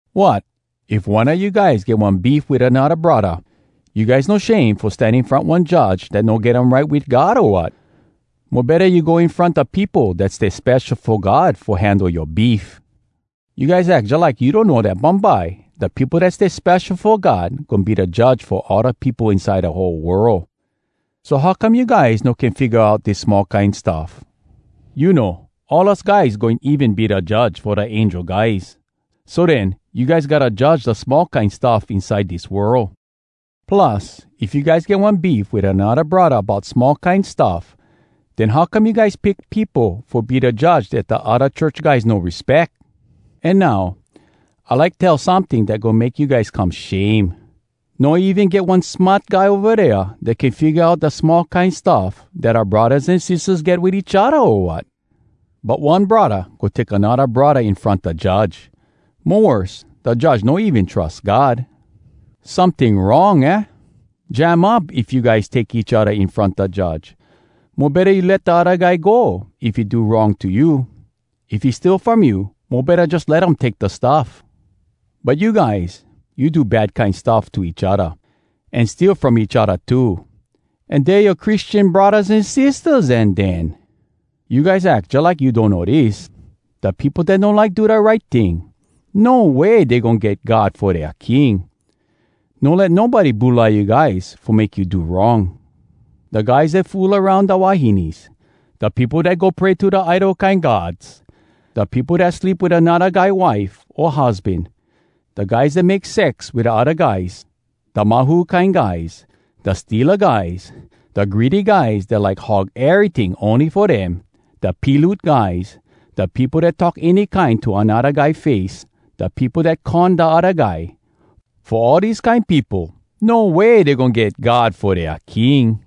Wot! If one a you guys get one beef wit anodda braddah, you guys no shame fo stan in front one judge dat no get um right wit God, o wat? Mo betta you go in front da peopo dat stay spesho fo God fo handle yoa beef! You guys ack jalike you donno dat bumbye, da peopo dat stay spesho fo God goin be da judge fo all da peopo inside da whole world. So how come you guys no can figga out dis small kine stuff? You know, all us guys goin even be da judge fo da angel guys. So den, you guys gotta judge da small kine stuff inside dis world. Plus, if you guys get one beef wit anodda braddah bout small kine stuff, den how come you guys pick peopo fo be da judge dat da odda church guys no respeck? An now, I like tell someting dat goin make you guys come shame: No even get one smart guy ova dea dat can figga out da small kine stuff dat oua braddahs an sistahs get wit each odda, o wat? But one braddah go take anodda braddah in front da judge! Mo worse, da judge no even trus God! Someting wrong, aah? Jam up, if you guys take each odda in front da judge. Mo betta you let da odda guy go if he do wrong to you! If he steal from you mo betta jus let um take da stuff! But you guys, you do bad kine stuff to each odda, an steal from each odda too, an dey yoa Christian braddahs an sistahs, an den! You guys ack jalike you donno dis: Da peopo dat no like do da right ting, no way dey goin get God fo dea king. No let nobody bulai you guys fo make you do wrong! Da guys dat fool aroun da wahines, da peopo dat go pray to da idol kine gods, da peopo dat sleep wit anodda guy wife o husban, da guys dat make sex wit odda guys, da mahu kine guys, da steala guys, da greedy guys dat like hog eryting ony fo dem, da piloot guys, da peopo dat talk any kine to anodda guy face, da peopo dat con da odda guy—fo all dese kine peopo, no way dey goin get God fo dea king!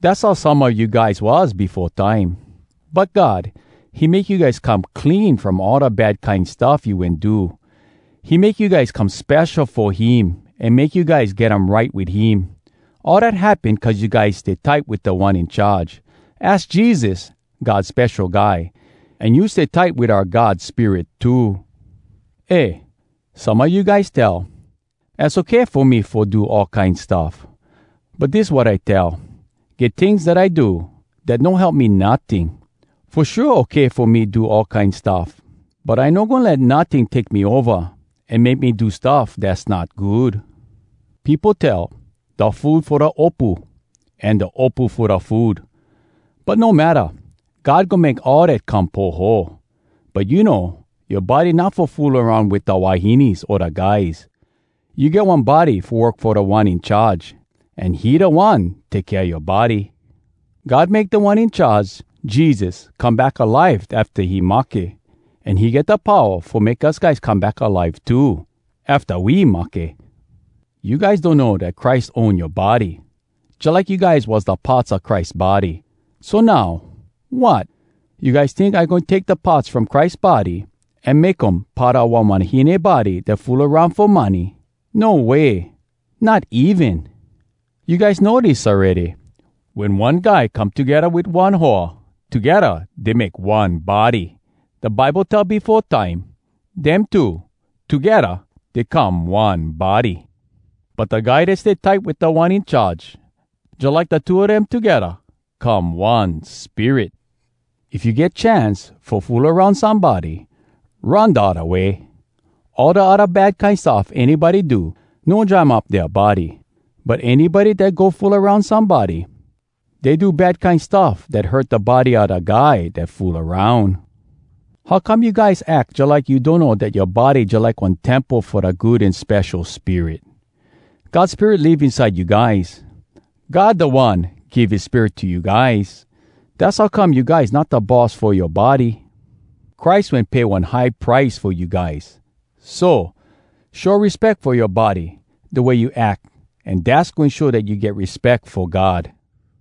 Dass how some a you guys was befo time. But God, he make you guys come clean from all da bad kine stuff you wen do. He make you guys come spesho fo him an make you guys get um right wit him. All dat happen cuz you guys stay tight wit Da One In Charge. Az Jesus, God Spesho Guy. An you stay tight wit oua God Spirit too. Eh! Some a you guys tell, “Az okay fo me fo do all kine stuff.” But dis wat I tell: “Get tings dat I do, dat no help me notting.” Fo shua, okay fo me fo do all kine stuff, but I no goin let notting take me ova an make me do stuff dass not good. Peopo tell, “Da food fo da opu, an da opu fo da food.” But no matta—God goin make all dat come poho. But you know, yoa body not fo fool aroun wit da wahines o da guys. You get one body fo work fo Da One In Charge, an he da One take kea yoa body. God make Da One In Charge, Jesus, come back alive afta he mahke. An he get da powa fo make us guys come back alive too, afta we mahke! You guys donno dat Christ own yoa body, jalike you guys was da parts a Christ body. So now, wat? You guys tink I goin take da parts from Christ body, an make um part a one wahine body dat fool aroun fo money? No way! Not even! You guys know dis awready: Wen one guy come togedda wit one hoa, togedda dey make one body. Da Bible tell befo time, “Dem two, togedda dey come one body.” But da guy dat stay tight wit Da One In Charge, jalike da two a dem togedda come one spirit. If you get chance fo fool aroun somebody, run da odda way! All da odda bad kine stuff anybody do, no jam up dea body. But anybody dat go fool aroun somebody, dey do bad kine stuff dat hurt da body a da guy dat fool aroun. How come you guys ack jalike you donno dat yoa body jalike one temple fo da Good An Spesho Spirit? God Spirit live inside you guys. God da One give his Spirit to you guys. Dass how come you guys not da boss fo yoa body. Christ wen pay one high price fo you guys. So, show respeck fo yoa body da way you ack, an dass goin show dat you get respeck fo God.